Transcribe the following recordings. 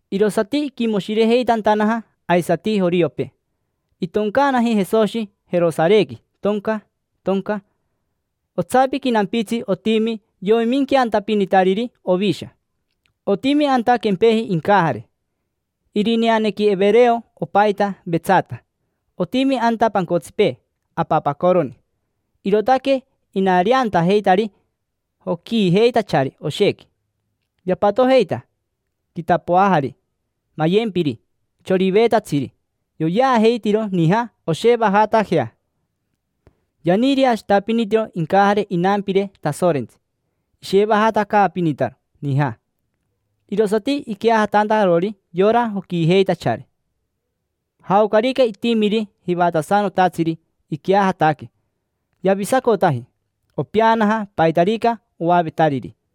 Irosati iquimoshirejeitantanaja aisati joriopee. Itoncaanaji Jesoshi Jerosarequi, tonca, tonca. Otsapiqui nampitsi otimi yoiminqueantapinitariri ovisha. Otimi anta quempeji incajare. Irineanequi Evereo opajita Vetsata. Otimi anta pancotsipee apapacoroni. Irootaque inariantajeitari joquiijeitachari oshequi. Yapatojeita quitapoajari, mayempiri, choriveetatsiri. Yoyeajeitiro nija oshevajatajea. Yaniireashitapinitiro incajare inampire Tasorentsi. Ishevajatacaapinitaro nija, irosati iqueajatantarori yora joquiijeitachari. Jaocarica itimiri jivatasanotatsiri iqueajataque, yavisacotaji; opeanaja paitarica oavetariri.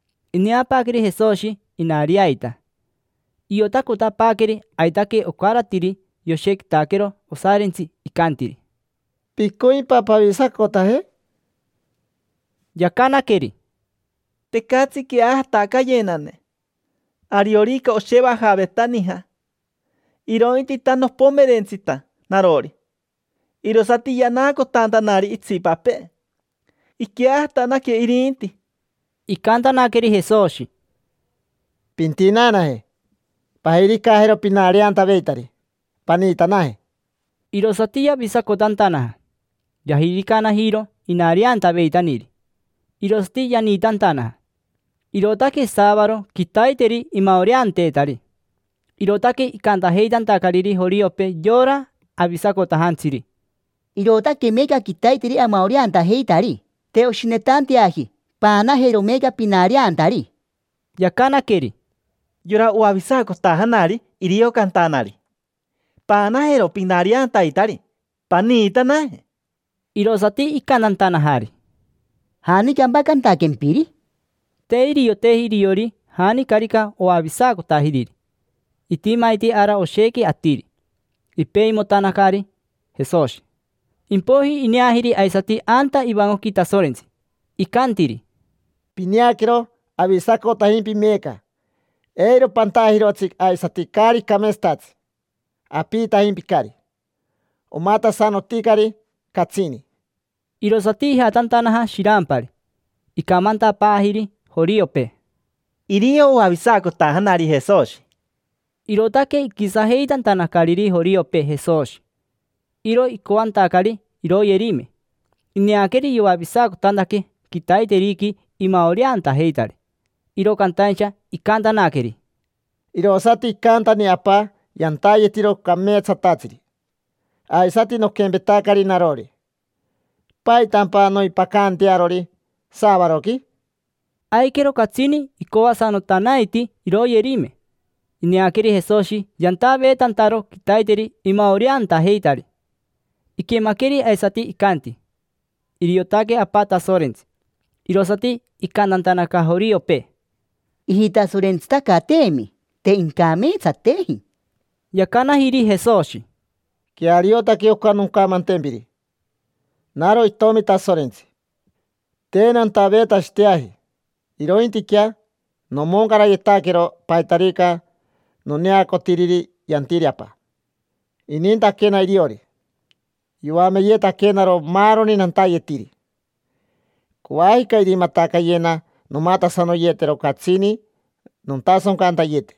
Ineapaaqueri Jesoshi inariaita. Iotacotapaaqueri aitaque ocaratiri yoshequitaquero osarintsi. Icantiri: —¿Picoimpa pavisacotaje? Yacanaqueri: —Tecatsi queajatacayenane ariorica oshevajaveta nija. Irointita nopomerentsita narori, irosati yanaacotantanari itsipapee: iqueajatanaque irinti. Icantanaqueri Jesoshi: —Pintinaanaje, pajiricajero pinariantaveitari, paniitanaje. Irosati yavisacotantanaja. Yajiricanajiro inariantaveitaniri, irosati yaniitantanaja. Irootaque saavaro, quitaiteri imaoreanteetari. Irootaque icantajeitantacariri joriopee yora avisacotajantsiri: —Irootaque meeca quitaiteri amaoreantajeitari. Te oshinetanteaji paanajero meeca pinariantari. Yacanaqueri: —Yora oavisacotajanari irio cantanari: “Paanajero pinariantaitari, paniitanaje”. Irosati icantantanajari: —¿Janicampa cantaquempiri? Te irioteji iriori janicarica oavisacotajiriri. Itimaiti ara oshequi atiri, ipeimotanacari Jesoshi. Impoiji ineajiri aisati anta ivancoqui Tasorentsi. Icantiri: —Pineaquero, avisacotajimpi meeca. Eiro pantajirotsi aisati caari cameetsatatsi. Apiitajimpicari, omatasanoticari catsini. Irosati ijatantanaja shirampari. Icamantapaajiri joriopee: —Irio oavisacotajanari Jesoshi. Irootaque iquisajeitantanacariri joriopee Jesoshi. Iro icoantacari iroyerime, ineaqueri yoavisacotantaque quitaiteriqui imaoreantajeitari. Iro cantaincha icantanaqueri: —Irosati icantani Apa yantayetiro cameetsatatsiri. Aisati noquempetacari narori: ¿paitampa noimpacaantearori saavaroqui? Aiquero catsini icoasanotanaiti iroyerime. Ineaqueri Jesoshi yantaveetantaro quitaiteri imaoreantajeitari. Iquemaqueri aisati icanti: “Iriotaque Apa Tasorentsi”. Irosati icantantanaca joriopee: —Ijitasorentsitacateemi, te incameetsateji. Yacanajiri Jesoshi: —Queariotaque oca noncamantempiri. Naro itomi Tasorentsi. Te nantaveetashiteaji, irointiquea nomoncarayetaquero paitarica noneacotiriri yantiri Apa. Inintaquena iriori, yoameyetaquenaro maaroni nantayetiri. Coajica irimatacayena nomatasanoyetero catsini nontasoncantayete,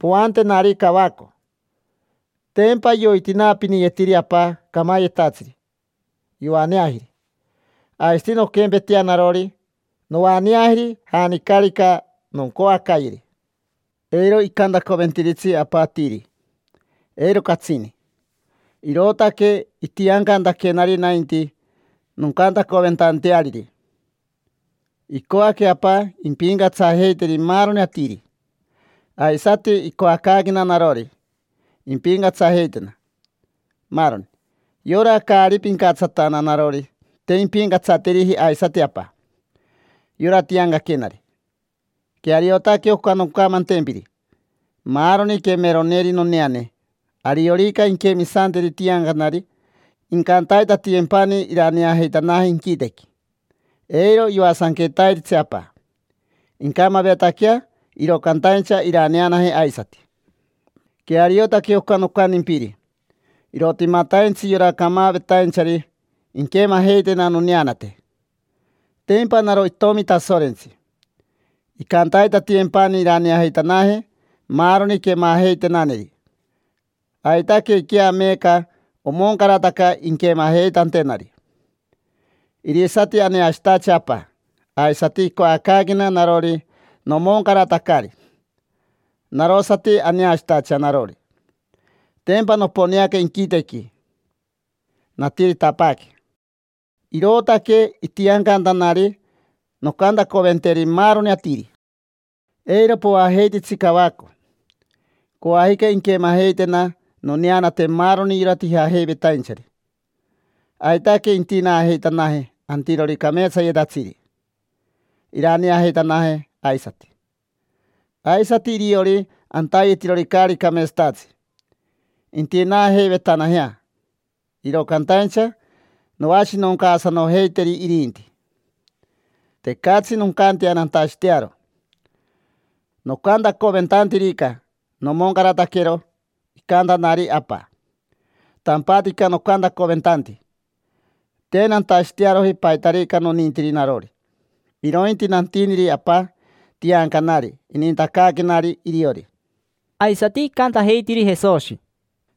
poantenari cavaco. Tempa yoitinaapiniyetiri Apa camayetatsiri, yoaneajiri. Aisati nonquempetea narori, noaneajeri janicarica noncoacayeri. Eiro icantacoventiritsi Apa atiri, eiro catsini; irootaque itiancantaquenari nainti noncantacoventanteariri. Icoaque Apa impincatsajeiteri maaroni atiri. Aisati icoacaaquena narori, impincatsajeitena maaroni. Yora caari pincatsatana narori, te impincatsateriji aisati Apa, yora tiancaquenari. Queariotaque oca noncamantempiri. Maaroni quemeroneri noneane, ariorica inquemisanteri tiancanari, incantaitatiyempani iraneajeitanaje inquitequi. Eiro yoasanquetairitsi Apa. Incamavetaquea, iro cantaincha iraneanaje aisati. Queariotaque oca nocantimpiri. Irotimataintsi yora camavetainchari inquemajeitena noneanate: tempa naro Itomi Tasorentsi. Icantaitatiyempani iraneajeitanaje maaroni quemajeitenaneri. Aitaquequea meeca omoncarataca inquemajeitantenari. Irisati aneashitacha Apa. Aisati icoacaaquena narori nomoncaratacari, narosati aneashitacha narori. Tempa noponeanaca inquitequi, natiritapaaque. Irootaque itiancantanari noncantacoventeri maaroni atiri. Eiro poajeititsi cavaco. Coajica inquemajeitena noneanate maaroni yora tijajeivetainchari. Aitaque intinaajeitanaje antirori cameetsayetatsiri, iraneajeitanaje aisati. Aisati iriori antayetirori caari cameetsatatsi: intinaajeivetanajea, iro cantaincha noashinoncaasanojeiteri irinti. Tecatsi noncantea nantashitearo. Nocantacoventantirica, nomoncarataquero icantanari Apa. Tampatica nocantacoventanti. Te nantashitearoji paitarica nonintiri narori, irointi nantiniri Apa tiancanari inintacaaquenari iriori. Aisati icantajeitiri Jesoshi: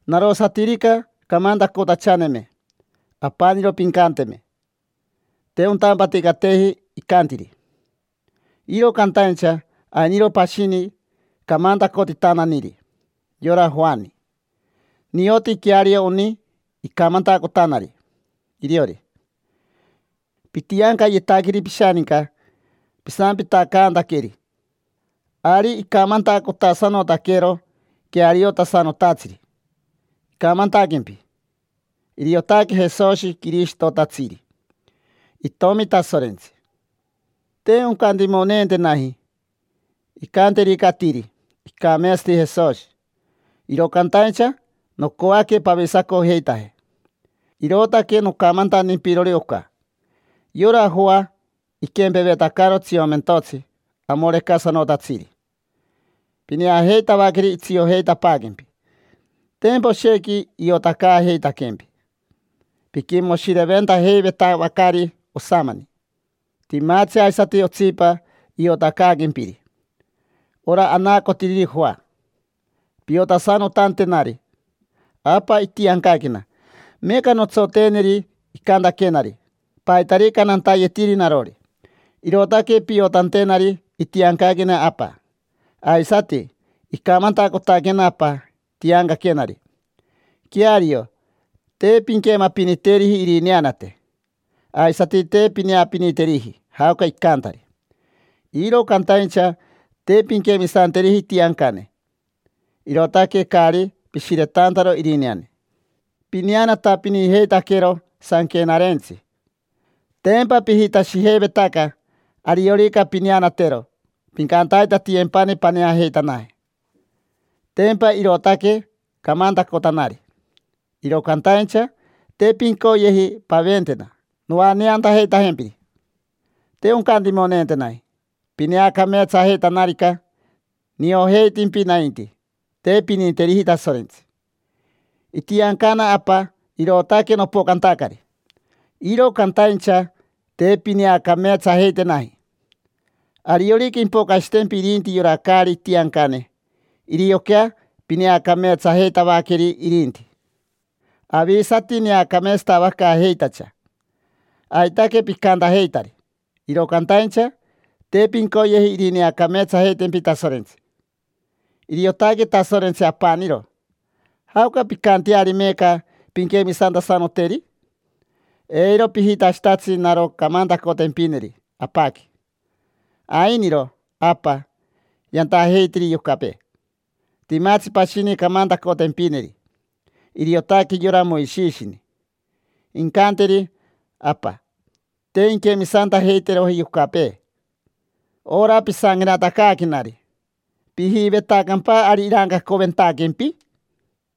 —Narosatirica camantacotachaneme apaniro pincanteme: “Te ontampaticateji icantiri”. Iro cantaincha ainiro pashini camantacotitananiri: yora Joani. Nioti queario oni icamantacotanari iriori. Pitiancayetaqueri pishaninca, pisampitacantaqueri. Ari icamantacotasanotaquero queariotasanotatsiri, icamantaquempi: “Iriotaque Jesoshi Quirishitotatsiri, Itomi Tasorentsi”. Te oncantimoneentenaji incanterica atiri: “Icameetsati Jesoshi”, iro cantaincha nocoaque pavisacojeitaje, irootaque nocamantantimpirori oca. Yora Joa iquempevetacaro tsiomentotsi amorecasanotatsiri. Pineajeitavaqueri itsiojeitapaaquempi: tempa oshequi iotacaajeitaquempi. Piquimoshireventajeivetavacari osamani. Timatsi aisati otsipa iotacaaquempiri, ora anaacotiriri Joa, piotasanotantenari. Apa itiancaquena. Meeca nontsoteeneri icantaquenari. Paitarica nantayetiri narori, irootaque piotantenari itiancaquena Apa. Aisati icamantacotaquena Apa tiancaquenari. Queario, te pinquemapiniteriji irineanate, aisati te pineapiniteriji jaoca icantari. Iro cantaincha te pinquemisanteriji itiancane, irootaque caari pishiretantaro irineane. Pineanatapinijeitaquero Sanquenarentsi, tempa pijitashijeivetaca ariorica pineanatero, pincantaitatiyempani paneajeitanaje. Tempa irootaque camantacotanari. Iro cantaincha te pincoyeji paventena noaneantajeitajempiri. Te oncantimoneentenaji pineacameetsajeitanarica. Niojeitimpi nainti, te pininteriji Tasorentsi. Itiancana Apa, irootaque nopocantacari. Iro cantaincha te pineacameetsajeitenaji. Ariorica impocashitempi irinti yora caari itiancane, irioquea pineacameetsajeitavaqueri irinti. Avisati neacameetsatavacaajeitacha. Aitaque picantajeitari. Iro cantaincha te pincoyeji irineacameetsajeitempi Tasorentsi. Iriotaque Tasorentsi apaniro. ¿Jaoca pincanteari meeca pinquemisantasanoteri? Eiro pijitashitatsi naro camantacotempineri Apaqui: “Ainiro, Apa, yantajeitiri yocapee”. Timatsi pashini camantacotempineri: iriotaque yora Moishishini, incanteri Apa: “Te inquemisantajeiteroji yocapee ora pisanquenatacaaquenari”. ¿Pijivetacampa ari irancacoventaquempi?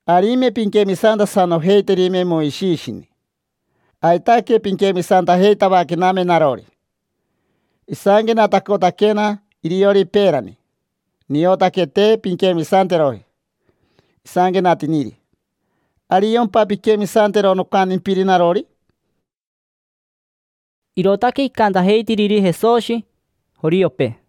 Arime pinquemisantasanojeiterime Moishishini, aitaque pinquemisantajeitavaquename narori. Isanquenatacotaquena iriori peerani. Niotaque te pinquemisanteroji isanquenatiniri. ¿Ariompa pinquemisantero nocantimpiri narori? Irootaque icantajeitiriri Jesoshi joriopee.